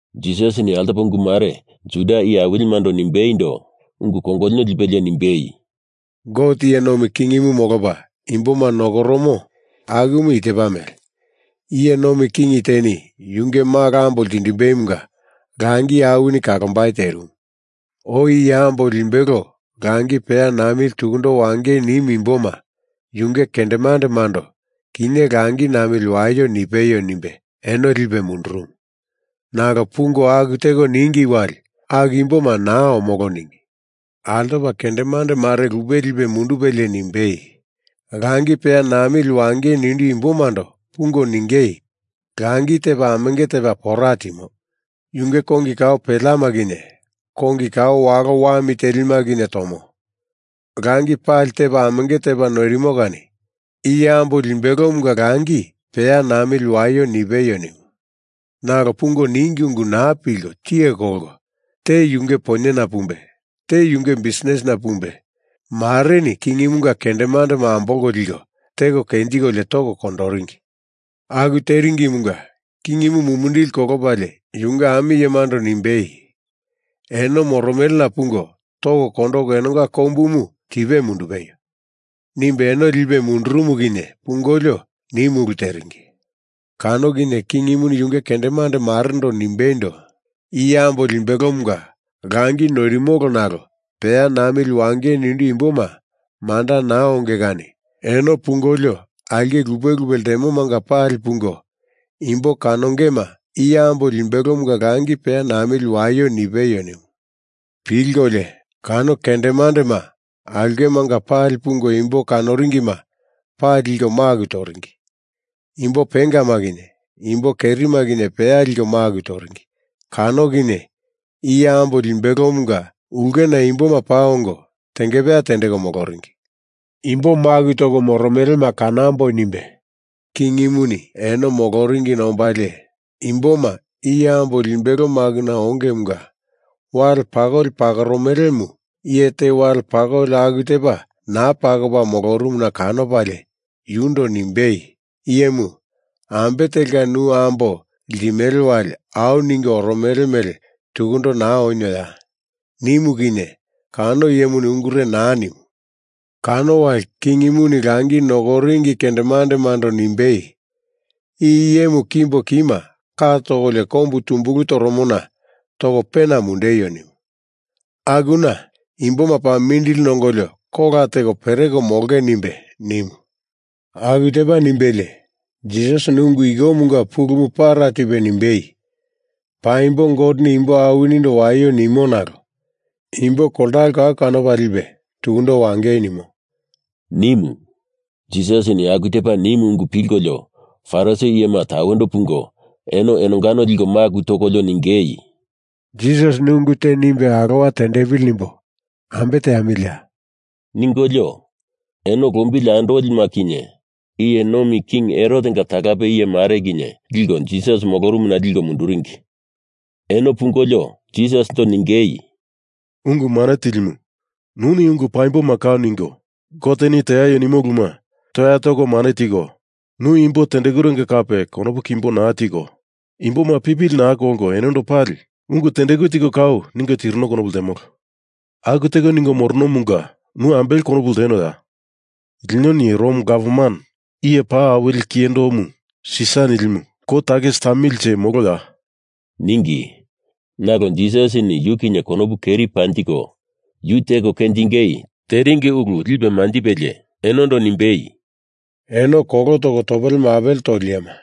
Jisasini altopa ungu mare Juda iye awilimando nimbeindo ungu kongolino lipelie nimbei, “Gote iye nomi kingimu molopa imboma nokoromo akumu i tepa mele: Iye nomi king teni yunge malo ambo limbelomunga langi awini kalombai terimu. Oi iye ambo limbelo langi peya namili tukundo wangei nimu imboma yunge kendemandemando ‘Kinye langi namili waio nipeio,’ nimbe eno lipe mundurumu, nalo pungo aku teko ningi wali aku imboma naa omolo ningi. Altopa kendemande mare lupe lipe mundupelie nimbei, ‘Langi peya namili wangei nindu imbomando pungo ningei, “Langi tepa amenge tepa pora timo. Yunge kongi kao peleama kinye kongi kao walo wami telima kinye tomo. Langi pali tepa amenge tepa noirimo kani iye ambo limbelomunga langi peya namili waio,” nipeio,’ nimu. Nalo pungo ningi ungu naa pilko tiye kolko, te yunge poinyena pumbe, te yunge bisnisina pumbe, mareni kingimunga kendemandema ambolko liko teko kenjikolio toko kondoringi. Aku teringimunga kingimu mumindili kolopalie yunge ami iyemando nimbei, ‘Eno moromelena pungo toko kondoko enonga kombumu tipe mundupeio,’ nimbe eno lipe mundurumu kinye pungolio, nimu ulu teringi. Kano kinye kingimuni yunge kendemande marendo nimbeindo, ‘Iye ambo limbelomunga langi noirimolo nalo peya namili wangei nindu imboma manda naa onge kani eno pungolio aulke lupe lupe ltemomanga pali pungo imbo kanongema iye ambo limbelomunga langi peya namili waio nipeio,’ nimu. Pilkolio kano kendemandema aulkemanga pali pungo imbo kanoringima pali liko maku toringi. Imbo pengama kinye imbo kerima kinye peya liko maku toringi. Kano kinye iye ambo limbelomunga ulkena imboma paa ongo tengepeya tendeko moloringi. Imbo maku toko moromelema kanamboi nimbe kingimuni eno moloringina ombalie, imboma iye ambo limbelo makuna ongemunga wale pakoli pakoromelemu iye te wale pakoli aku tepa naa pakopa molorumuna kanopalie yundo nimbei, ‘Iyemu ambe telka nu ambo ltimele wali, au ningo oromele mele tukundo naa onioya?’ nimu kinye kano iyemuni ungure naa nimu. Kano wali kingimuni langi nokoringi kendemandemando nimbei, ‘I iyemu kimbo kima ka tokolio kombu tumbulu toromona toko pena mundeio!’ nimu. Akuna imboma paa mindili nongolio kola teko pereko molonge,” nimbe nimu. Aku tepa nimbelie Jisasini ungu ikomunga pulumu para tipe nimbei, “Paimbo Goteni imbo awinindo waio nimo nalo imbo koltalo kau kanopa lipe tukundo wangei nimo,” nimu. Jisasini aku tepa nimu ungu pilkolio Farisi iyema tawendo pungo eno enongano liko maku tokolio ningei, “Jisasini ungu te nimbe alowa tendepili nimbo ambe teamiliya?” ningolio, eno lombili andolima kinye iye nomi king Herotenga talape iye mare kinye liko Jisas molorumuna liko munduringi. Eno pungolio Jisasindo ningei, “Ungu Mane Tilimu, nuni ungu paimboma kau ningo, Goteni teaio nimo uluma toya toko mane tiko, nu imbo tendekurenga kape konopu kimbo naa tiko, imboma pipili naa kolko enondo pali ungu tendeku tiko kau ningo tirino konopu ltemolo. Aku teko ningo moronomunga nu ambele konopu ltenoya? Linoni Rom Gavman Iye Paa Awili Kiyendomu Sisar nilimu kou takisi tamilinje moloya?” ningi. Nalo Jisasini yu kinye konopu keri panjiko yu teko kenjingei teringi ulu lipe manjipelie enondo nimbei, “Eno kolo toko topele mapele toli iyema,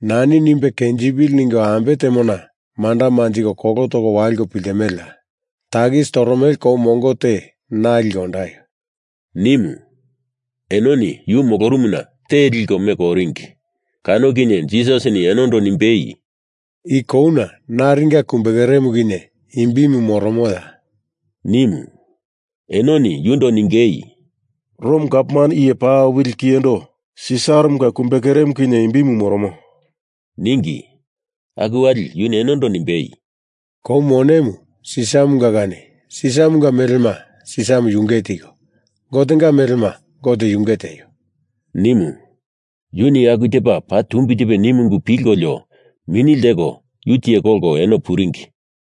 nani nimbe kenjipili ningo ambe temona manda manjiko kolo toko waliko piltimeleya? Takisi toromele kou mongo te na liko ondaio,” nimu. Enoni yu molorumuna te liko meko oringi. Kano kinye Jisasini enondo nimbei, “I kouna naringa kumbekeremu kinye imbimu moromoya?” nimu. Enoni yundo ningei, “Rom Gavman Iye Paa Awili Kiyendo Sisaramunga kumbekeremu kinye imbimu moromo,” ningi. Aku wali yuni enondo nimbei, “Kou monemu Sisaramunga kani Sisaramunga melema Sisaramu yunge tiko, Gotenga melema Gote yunge tieio,” nimu. Yuni aku tepa paa tumbi tipe nimu ungu pilkolio mini lteko yu tiye kolko eno puringi.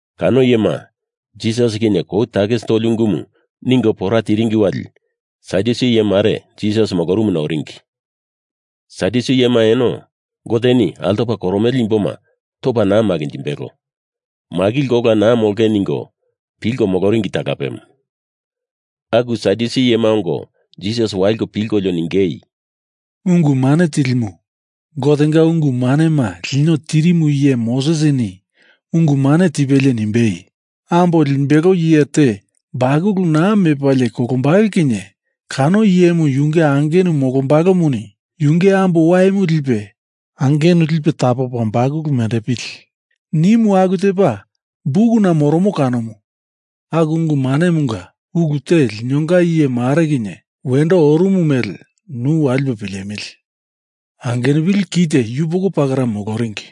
Kano iyema Jisas kinye kou takisi toli ungumu ningo pora tiringi wali Sadyusi iye mare Jisas molorumuna oringi. Sadyusi iyema eno Goteni altopa koromele imboma topa naa makinjimbelo, makilko ola naa molonge ningo pilko moloringi talapemu. Aku Sadyusi iyema ongo Jisas waliko pilkolio ningei, “Ungu Mane Tilimu, Gotenga ungu manema lino tirimu iye Mosesini ungu mane tipelie nimbei, Ambo limbelo iye te bakulu naa mepalie kolombalo kinye kano iyemu yunge angenu molombalomuni yunge ambo waimu lipe angenu lipe tapopa bakulu mendepili, nimu aku tepa bukuna moromo kanomu. Aku ungu manemunga ulu te linonga iye mare kinye wendo orumu mele nu walipo pilemili. Angenupili kite yupoko pakera moloringi.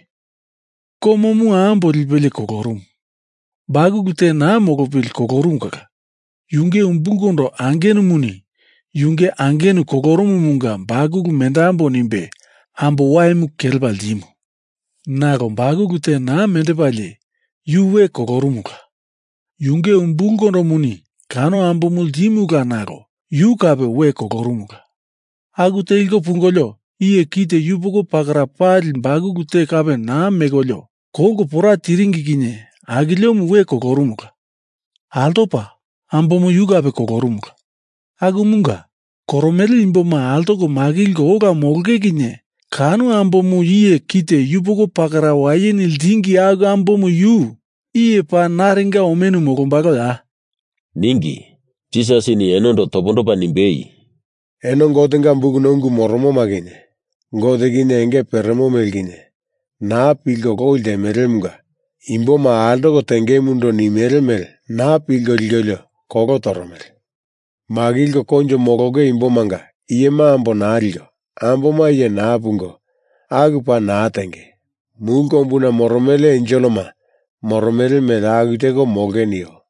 Komomu ambo lipelie kolorumu. Bakulu te naa molopili kolorumu kala yunge umbulkondo angenumuni yunge angenu kolorumumunga bakulu mendambo nimbe ambo waimu kelepa ltimu. Nalo bakulu te naa mendepalie yu we kolorumula. Yunge umbulkondomuni kano ambomu ltimula nalo yu kape we kolorumula. Aku teliko pungolio iye kite yupoko pakera pali bakulu te kape naa mekolio kolko pora tiringi kinye akiliomu we kolorumula. Altopa ambomu yu kape kolorumula. Akumunga, koromele imboma altoko makilko ola molonge kinye kano ambomu iye kite yupoko pakera wayeni ltingi aku ambomu yu iye paa naringa omenu molombaloya?” ningi. Jisasini enondo topondopa nimbei, “Eno Gotenga bukuna ungu moromoma kinye, Gote kinye enge peremo mele kinye, naa pilko loi ltemelemunga imboma altoko tengemundo nimele mele naa pilko likolio kolo toromele. Makilko koinjo molonge imbomanga iyema ambo naa liko, amboma iye naa pungo, aku paa naa tenge. Mulu kombuna moromele enselema moromele mele aku teko molonge nio.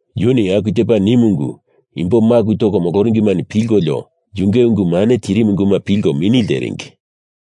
Yuni aku tepa nimu ungu imbo maku toko moloringimani pilkolio yunge ungu mane tirimu unguma pilko mini lteringi.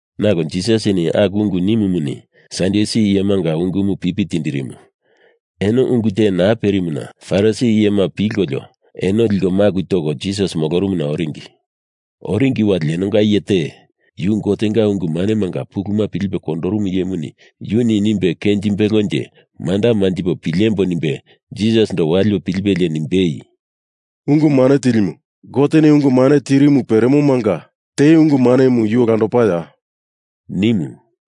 Nalo Jisasini aku ungu nimumuni Sadyusi iyemanga ungumu pipi tindirimu, eno ungu te naa perimuna Farisi iyemani pilkolio eno liko maku toko Jisas molorumuna oringi. Oringi wali enonga iye te, yu Gotenga ungu manemanga puluma pilipe kondorumu iyemuni yuni nimbe kenjimbelonje manda manjipo pilemboi nimbe Jisasindo walipe pilipelie nimbei, “Ungu Mane Tilimu, Goteni ungu mane tirimu peremomanga te ungu manemu yu olandopaya?” nimu.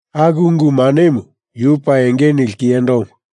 Aku ungu manemu yu paa enge nili kiyendomu.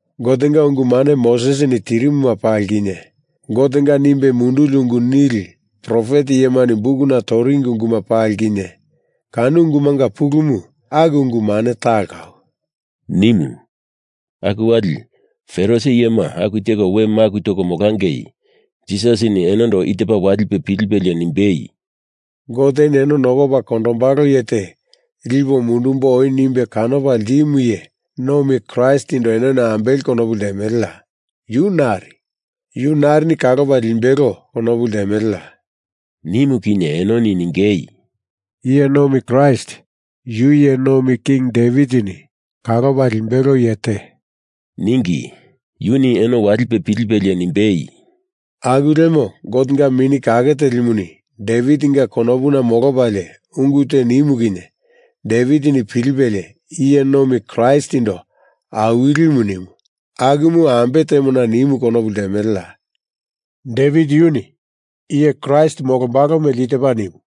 Gotenga ungu mane Mosesini tirimuma pali kinye, Gotenga nimbe munduli ungu nili profet iyemani bukuna toringi unguma pali kinye, kano ungumanga pulumu aku ungu mane talo kau,” nimu. Aku wali Parisi iyema aku teko we maku toko molangei Jisasini enondo i tepa walipe pilipelie nimbei, “Goteni eno nokopa kondombalo iye te lipo mundumbo oi nimbe kanopa ltimu iye nomi Kraistindo enoni ambele konopu ltemeleya? Yu nari? Yu narini kalopa limbelo konopu ltemeleya?” nimu kinye enoni ningei, “Iye nomi Kraist yu iye nomi king Devitini kalopa limbelo iye te,” ningi. Yuni eno walipe pilipelie nimbei, “Aku lemo Gotenga Mini Kake Telimu Devitinga konopuna molopalie ungu te nimu kinye Devitini pilipelie iye nomi Kraistindo Awilimu nimu akumu ambe temona nimu konopu ltemeleya? Devit yuni iye Kraist molombalo mele i tepa nimu,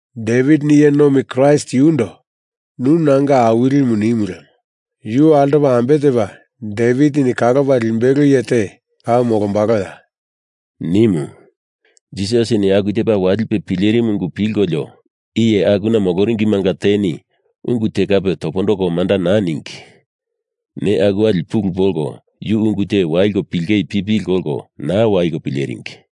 Devitini iye nomi Kraist yundo nu nanga Awilimu nimu lemo yu altopa ambe tepa Devitini kalopa limbelo iye te kau molombaloya?” nimu. Jisasini aku tepa walipe pilerimu ungu pilkolio iye akuna moloringimanga teni ungu te kape topondoko manda naa ningi. Neya aku wali pulu polko yu ungu te waliko pilingei pipili kolko naa waliko pileringi.